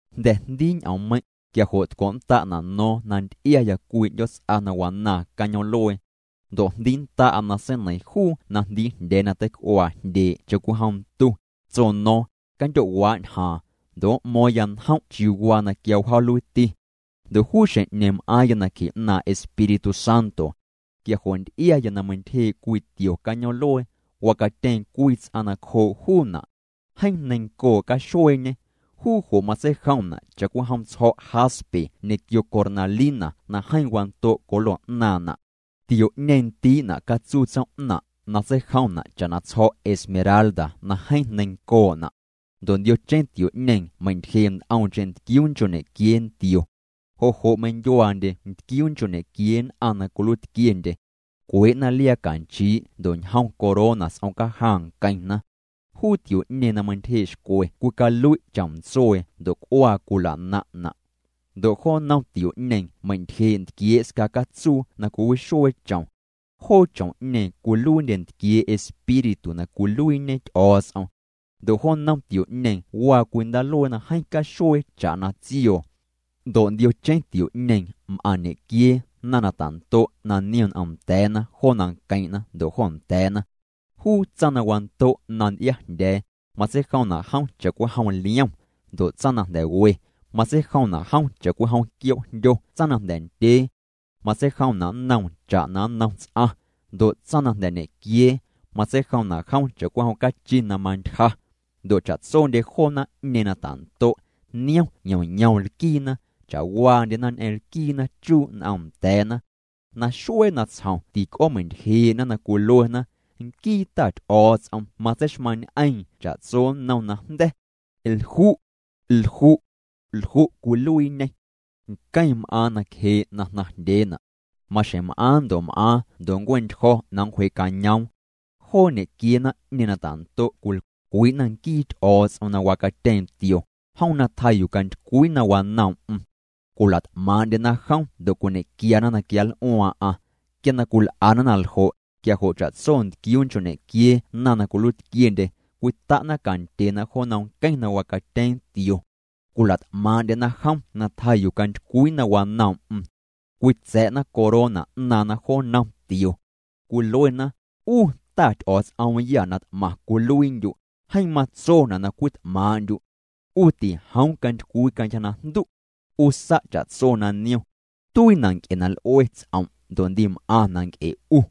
Jnda̱ jndii ñ'oommeiⁿ', quia jo' tco'nnda'na' no̱o̱ⁿ na nty'iaya cwii 'ndyoots'a na wanaaⁿ cañoom'luee. Ndo' jndiinnda'a na seineiⁿ juu na jndiijndya̱a̱ na teic'uaa jndyee' cha'cwijom ntu, tso no̱o̱ⁿ: —Candyo'waa' ñjaaⁿ, ndo' m'mo̱o̱ⁿya njom' chiuu waa na quia wjaaluiiti. Ndo' juu xjeⁿ'ñeeⁿ m'aaⁿya nacje 'naaⁿ' Espíritu Santo. Quia jo' nty'iaya na meintyjee' cwii tio cañoom'luee, wacatyeeⁿ cwii ts'aⁿ nacjoo' juuna'. Jeeⁿ neiⁿncoo' caxueeñê. Juu jo' matseijomna' cha'cwijom tsjo̱' jaspe ñequio cornalina na jeeⁿ wando' colo 'naaⁿna'. Tio'ñeeⁿ ndii'na' catsuutsoom'naⁿ' na tseijomna' cha'na tsjo̱' esmeralda na jeeⁿ neiⁿncoo'na'. Ndo' ndiocheⁿ tio'ñeeⁿ meintyjee' nt'omcheⁿ ntquiuu nchoo' ñequiee ntio. Jo' jo' meindyuaandye ntquiuu nchoo' ñequiee nn'aⁿ na cwiluiitquiendye. Cwee'na liaa canchii' ndo' ñjom corona s'om cajaⁿ nqueⁿna. Juu tio'ñeeⁿ na meintyjee' xcwe cwicalui' chom ntsuee ndo' c'uaa cwila'naⁿ'na'. Ndo' jo nnom tio'ñeeⁿ meintyjee' ntquiee' sca catsuu na cwiwixuee chom. Joo chom'ñeeⁿ cwiluiindye ntquiee' Espíritu na cwiluiiñe Ty'o̱o̱ts'om. Ndo' jo nnom tio'ñeeⁿ waa cwii ndaaluee na jeeⁿ caxuee cha'na tsioo. Ndo' ndiocheⁿ tio'ñeeⁿ m'aⁿ ñequiee naⁿ na ta'ndo' na niom n'om nda̱a̱na jo nanqueⁿ'na ndo' jo nda̱a̱na. Juu tsaⁿ na wando' na nty'iajndya̱a̱, matseijomna' jom cha'cwijom liom. Ndo' tsaⁿ na jnda̱ we, matseijomna' jom cha'cwijom quioo'jndyo. Tsaⁿ na jnda̱ ndyee, matseijomna' nnoom cha'na nnom ts'aⁿ. Ndo' tsaⁿ na jnda̱ ñequiee, matseijomna' jom cha'cwijom cachi na mantyja. Ndo' cha'tsondye joo naⁿ'ñeeⁿ na ta'ndo', niom yom yom lquiina. Cha'waandyena ñ'eⁿ lquiina chuu' n'om nda̱a̱na. Naxuee natsjom tic'oomeintyjee'na na cwiluena: Nquii Ta Ty'o̱o̱ts'om matseixmaⁿñ'eeⁿ cha'tso nnom najnda̱. Lju'. Lju'. Lju' cwiluiiñê. Nqueⁿ m'aaⁿ nacjee' na jnaⁿjndyeena'. Maxjeⁿ m'aaⁿ ndo' m'aaⁿ ndo' nncue'ntyjo̱ na nncwjee'cañoom. Joo ñequiee naⁿ'ñeeⁿ na ta'ndo', cwilcwii'na nquii Ty'o̱o̱ts'om na wacatyeeⁿ tio, jom na tjaa yuu cantycwii na wanoom'm. Cwila't'maaⁿ'ndyena jom ndo' cwiñe'quiana na quianl'uaaⁿ'aⁿ. Quia na cwil'ana na ljo', quia jo' cha'tso ntquiuu nchoo' ñequiee naⁿ na cwiluiitquiendye cwita'na cantyena jo nnom nqueⁿ na wacatyeeⁿ tio. Cwila't'maaⁿ'ndyena jom na tjaa yuu cantycwii na wanoom'm. Cwitsa̱'na corona 'naaⁿna jo nnom tio. Cwiluena: 'U Ta Ty'o̱o̱ts'oomyâ na t'maⁿ cwiluiindyu', jeeⁿ matsona' na cwit'maaⁿ'ndyu'. 'U tijoom cantycwii cantyja najndu'. 'U sa' cha'tso na niom. Tuiina' nc'e na l'ue ts'om' ndo' ndim'aⁿna' nc'e 'u.